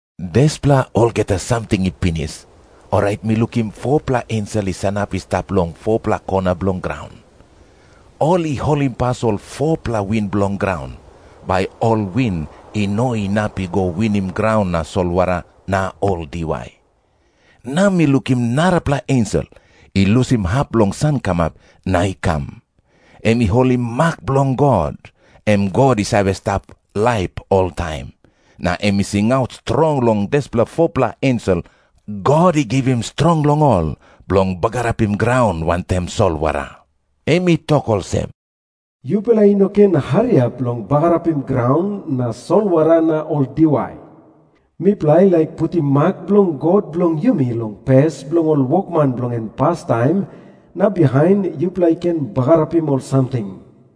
Dispela olgeta samting i pinis, orait mi lukim 4-pela ensel i sanap i stap long ol 4-pela kona bilong graun. Ol i holimpas ol 4-pela win bilong graun, bai ol win i no inap i go winim graun na solwara na ol diwai. Na mi lukim narapela ensel i lusim hap bilong sankamap na i kam. Em i holim mak bilong God, em God i save stap laip oltaim, na em i singaut strong long dispela 4-pela ensel God i givim strong long ol bilong bagarapim graun wantaim solwara. Em i tok olsem, "Yupela i no ken hariap long bagarapim graun na solwara na ol diwai. Mipela i laik putim mak bilong God bilong yumi long pes bilong ol wokman bilong en pastaim, na bihain yupela i ken bagarapim ol samting."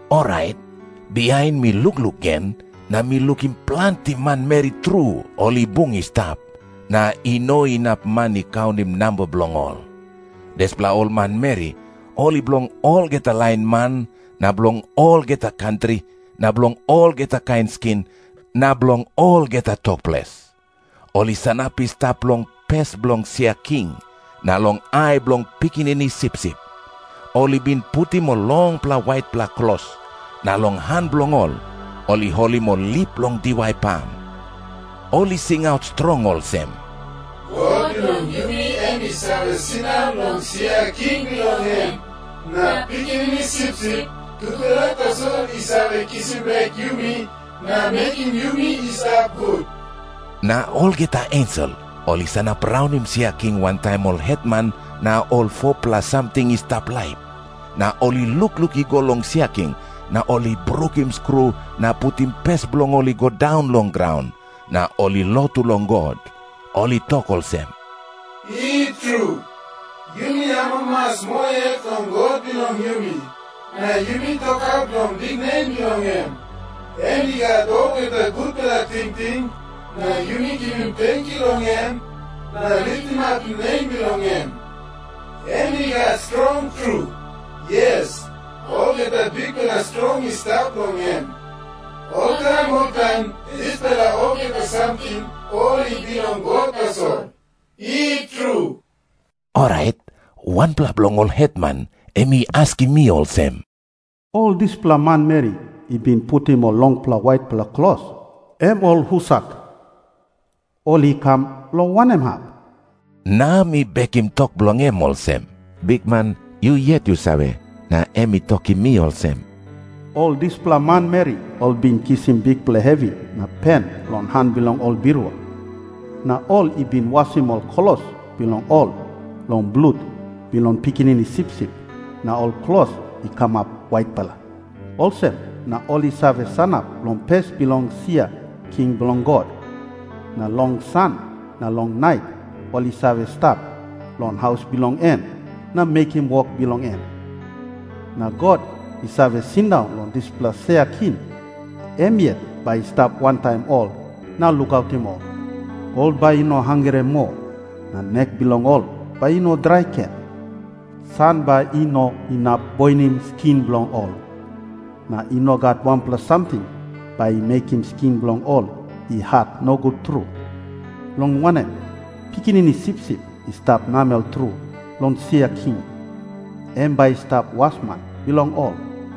Orait bihain mi lukluk gen, na mi lukim planti manmeri tru ol i bung i stap, na i no inap man i kaunim namba bilong ol. Dispela ol manmeri ol i bilong olgeta lain man na bilong olgeta kantri na bilong olgeta kain skin na bilong olgeta tok ples. Ol i sanap i stap long pes bilong sia king na long ai bilong Pikinini Sipsip. Ol i bin putim ol longpela waitpela klos, na long han bilong ol, ol i holim ol lip bilong diwai pam. Ol i singaut strong olsem, "God bilong yumi em i save sindaun long sia king bilong en, na Pikinini Sipsip, tupela tasol i save kisim bek yumi na mekim yumi i stap gut." Na olgeta ensel ol i sanap raunim sia king wantaim ol hetman na ol 4-pela samting i stap laip. Na ol i lukluk i go long sia king na ol i brukim skru na putim pes bilong ol i go daun long graun, na ol i lotu long God. Ol i tok olsem, "I tru. Yumi amamas moa yet long God bilong yumi, na yumi tokaut long biknem bilong em. Em i gat olgeta gutpela tingting, na yumi givim tenkyu long em, na litimapim nem bilong em. Em i gat strong tru. Yes, olgeta bikpela strong i stap long em. Oltaim oltaim dispela olgeta samting ol i bilong God tasol. I tru." Orait wanpela bilong ol hetman em i askim mi olsem, "Ol dispela manmeri i bin putim ol longpela waitpela klos, em ol husat? Ol i kam long wanem hap?" Na mi bekim tok bilong em olsem, "Bikman, yu yet yu save" na em I tokim mi olsem "Ol dispela manmeri ol i bin kisim bikpela hevi na pen long han bilong ol birua. Na ol i bin wasim ol klos bilong ol long blut bilong Pikinini Sipsip, na ol klos i kamap waitpela. Olsem na ol i save sanap long pes bilong sia king bilong God. Na long san na long nait ol i save stap long haus bilong en na mekim wok bilong en. Na God i save sindaun long dispela sia king, em yet bai i stap wantaim ol na lukautim ol. Ol bai i no hangre moa, na nek bilong ol bai i no drai gen. San bai i no inap boinim skin bilong ol, na i no gat wanpela samting bai i mekim skin bilong ol i hat nogut tru. Long wanem, Pikinini Sipsip i stap namel tru long sia king, em bai i stap wasman bilong ol.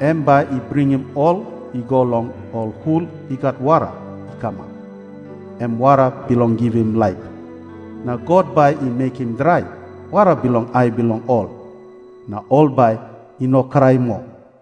Em bai i bringim ol i go long ol hul i gat wara i kamap, em wara bilong givim laip. Na God bai i mekim drai wara bilong ai bilong ol, na ol bai i no krai moa."